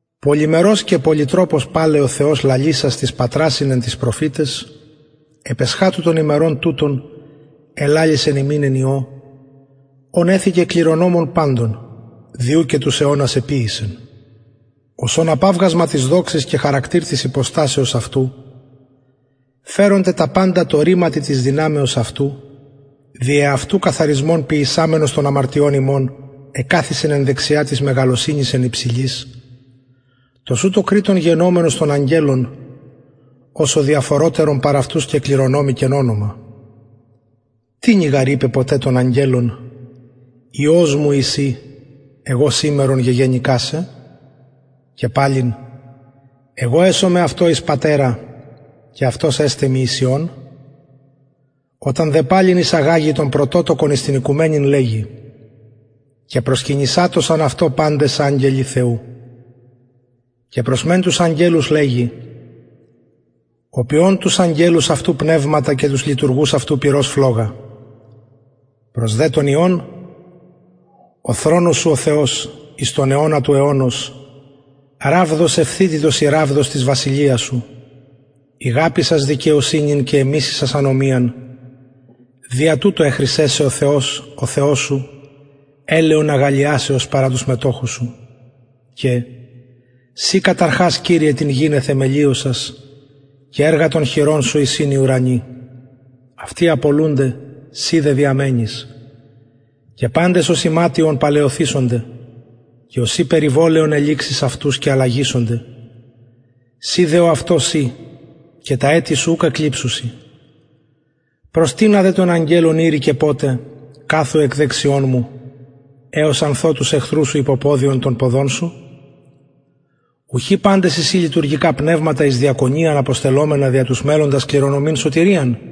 πολυμερως και πολυτροπως παλαι ο θεος λαλησας τοις πατρασιν εν τοις προφηταις επ εσχατου των ημερων τουτων ελαλησεν ημιν εν υιω ον εθηκεν κληρονομον παντων δι ου και τους αιωνας εποιησεν ος ων απαυγασμα της δοξης και χαρακτηρ της υποστασεως αυτου φερων τε τα παντα τω ρηματι της δυναμεως αυτου δι εαυτου καθαρισμον ποιησαμενος των αμαρτιων ημων εκαθισεν εν δεξια της μεγαλωσυνης εν υψηλοις τοσουτω κρειττων γενομενος των αγγελων οσω διαφορωτερον παρ αυτους κεκληρονομηκεν ονομα τινι γαρ ειπεν ποτε των αγγελων υιος μου ει συ εγω σημερον γεγεννηκα σε και παλιν εγω εσομαι αυτω εις πατερα και αυτος εσται μοι εις υιον οταν δε παλιν εισαγαγη τον πρωτοτοκον εις την οικουμενην λεγει και προσκυνησατωσαν αυτω παντες αγγελοι θεου και προς μεν τους αγγελους λεγει ο ποιων τους αγγελους αυτου πνευματα και τους λειτουργους αυτου πυρος φλογα προς δε τον υιον ο θρονος σου ο θεος εις τον αιωνα του αιωνος ραβδος ευθυτητος η ραβδος της βασιλειας σου ηγαπησας δικαιοσυνην και εμισησας ανομιαν δια τουτο εχρισεν σε ο θεος ο θεος σου ελαιον αγαλλιασεως παρα τους μετοχους σου και συ κατ αρχας κυριε την γην εθεμελιωσας και εργα των χειρων σου εισιν οι ουρανοι αυτοι απολουνται συ δε διαμενεις και παντες ως ιματιον παλαιωθησονται και ωσει περιβολαιον ελιξεις αυτους και αλλαγησονται συ δε ο αυτος ει και τα ετη σου ουκ εκλειψουσιν προς τινα δε των αγγελων ειρηκεν ποτε καθου εκ δεξιων μου εως αν θω τους εχθρους σου υποποδιον των ποδων σου ουχι παντες εισιν λειτουργικα πνευματα εις διακονιαν αποστελλομενα δια τους μελλοντας κληρονομειν σωτηριαν